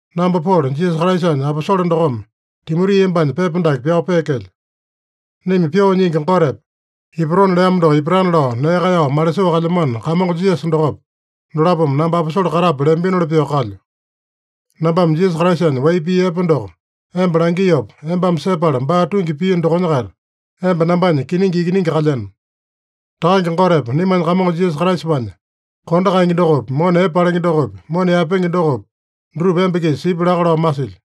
Namba Polo, Jisasa Kraisanya aposole dokome Timoti embanya pepa dake pyao peekelyo. Naima Pyoo Nyingi Gotepa, ipatona leamo doko ipatana lao nee kaeyao malisoo kalyamano Kamongo Jisasa dokopa, dolapome namba aposole katape leambinoli pyoo kalyo. Nambame Jisasa Kraisanya wai pii epe doko emba langiopa, embame sepala baa tungi piino dokonya-kaita, emba nambanya kiningi ikiningi kalyeno. Takange Gotepa naimanya Kamongo Jisasa Kraisapanya kondo kaenge dokopi, mona epe palenge dokopi, mona yaepenge dokopi, dutupa emba-kisa sipya laka lao masilyo.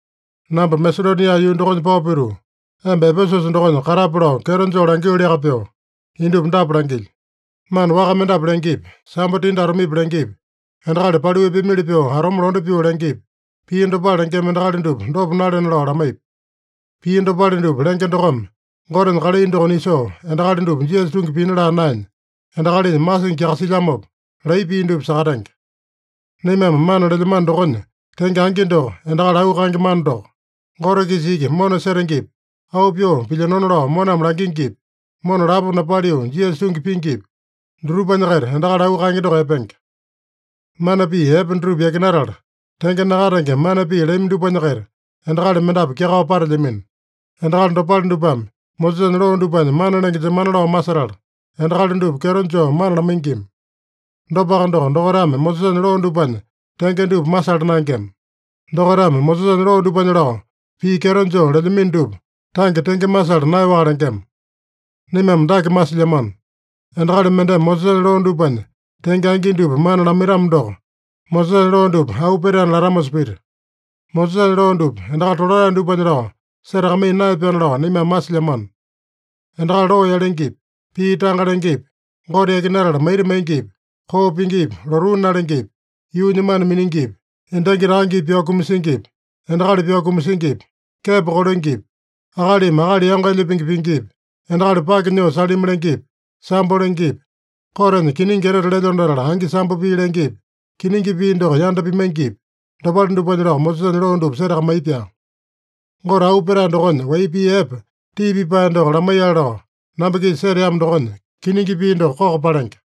Namba Masedonia yuu dokonya pao pituu, emba Epesusa dokonya katape lao kyeto joo langioliaka pyoo, indupa dapa langilyo: Mana waka mendapu lengepi, sambo tindi atomepi lengepi, endakali paliu epeamili pyoo atome londe pyoo lengepi, pii dopale lengema endakali dupa dopa nalena lao lamaipi. Pii dopale dupa lenge dokome, Gotenya kalai doko nisoo, endakali dupa Jisasa tungi pina laa naenya, endakalinya masingi kyakasilyamopa laiya pii dupa sakatenge. Naimame mana lelyamano dokonya tenge angi doko, endakali auu kaenge mana doko. Gote-kisa iki mona setengepi, auu pyoo pilyinona lao moname langingipi, mona lapo napaliu Jisasa tungi pingipi, dutupanya-kaita endakali auu kaenge doko epenge. Mana pii epe dutupa yakinatala, tenge nakatenge mana pii lami dupanya-kaita endakali mendapu kyakao patelyamino. Endakali dopale dupame Mosesanya loo dupanya mana lenge jemana lao masetala, endakali dupa kyeto joo mana lamaingima. Dopaka doko, dokaitame Mosesanya loo dupanya tenge dupa masala naengema. Dokaitame Mosesanya loo dupanya lao pii kyeto joo lelyamino dupa, tange tenge masala naeyaowaka lengema. Naimame dake masilyamano: Endakali mendeme Mosesanya loo dupanya tenge angi dupa mana lamaitamo doko, Mosesanya loo dupa auu petaena latamosa pita. Mosesanya loo dupa endakali tolatae dupanya lao setakamaiya naeya-pyaana lao naimame masilyamano. Endakali loo yalengepi, pii tanga lengepi, Gote yakinatala maita maingipi, koo pingipi, lotuu nalengepi, yuunya mana miningipi, endangi takangepi pyao kumasingipi, endakali pyao kumasingipi, kepo kolengepi, akalimi akali yango elya pingi pingipi, endakali pake nyoo salimi lengepi, sambo lengepi, kotenya kiningi etete lelyona latala angi sambo pii lengepi, kiningi pii doko yanda pimaingipi, dopale dupanya lao Mosesanya loo dupa setakamaiya-pyaa. Gote auu petae dokonya wai pii epe tii pipae doko lamaiyale lao namba-kisa seteamo dokonya, kiningi pii doko koko palenge.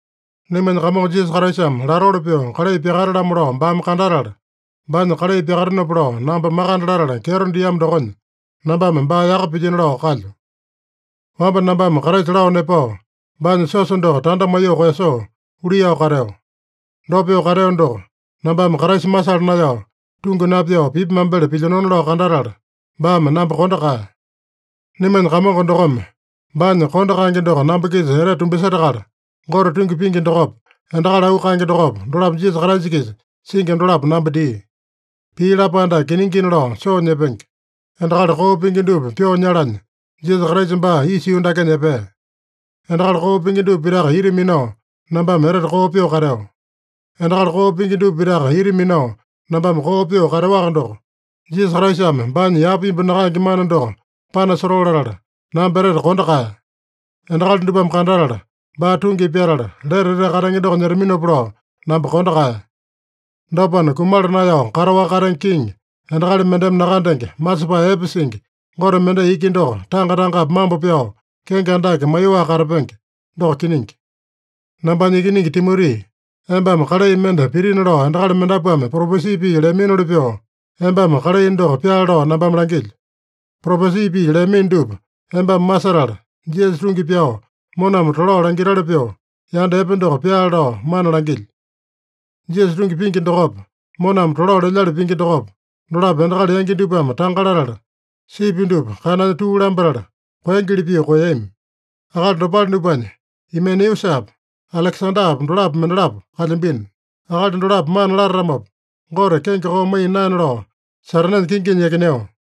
Naimanya Kamongo Jisasa Kraisame latoli pyoo kalai pyakate-lamo lao baame kandatala, baanya kalai pyakatenopa lao namba makande latala kyeto diamo dokonya, nambame baa yaka pilyino lao kalyo. Wamba nambame Kraisa lao nepao, baanya siosa doko tanda maiyoo koeyasoo, luiyao kateo. Dopa pyoo kateo doko, nambame Kraisa masala naeyao, tungi napyao pipi mambele pilyinona lao kandatala, baame namba kondo kaeya. Naimanya Kamongo dokome baanya kondo kaenge doko namba-kisa etete tumbasetakala, Gote tungi pingi dokopa, endakali auu kaenge dokopa, dolapo Jisasa Kraisa-kisa singi dolapo namba dia. Pii lapae dake kiningina lao soo nyepenge: Endakali koo pingi dupa pyoo nyalanya, Jisasa Kraisa baa isa yuu dakenya epea. Endakali koo pingi dupa pitaka ita minao, nambame etete koo pyoo kateo. Endakali koo pingi dupa pitaka ita minao nambame koo pyoo kateowaka doko, Jisasa Kraisame baanya yapa imbu nakaenge mana doko panasotoo latala, namba etete kondo kaeya. Endakali dupame kandatala, baa tungi pyatala, lete etete katenge doko nyetaminopa lao, namba kondo kaeya. Dopana, kumala naeyao kataowaka katenge Kiŋi, endakali mendeme nakandenge, masepae epe singi, Gote mendai iki doko tanga-tangapi mambo pyao, kenge andake maiyoaka katapenge. Doko kiningi. Nambanya ikiningi Timoti, embame kalai mende pitina lao endakali mendapuame propesi pii leaminoli pyoo, embame kalai doko pyaale lao nambame langilyo. Propesi pii leamino dupa embame masetala, Jisasa tungi pyao, moname tolao langitali pyoo, yanda epe doko pyaale lao mana langilyo. Jisasa tungi pingi dokopa, moname tolao lelyali pingi dokopa, dolapo endakali yangi dupame tanga latala, sipi dupa kananya tuu lambatala koengeli pyoo koeyami. Akali dopale dupanya Imeneusapa, Alekesandapa dolapo mendalapo kalyambino. Akali dolapo mana latatamopa, Gote kenge koo maiya naena lao, Satanenya kinginya yakineo.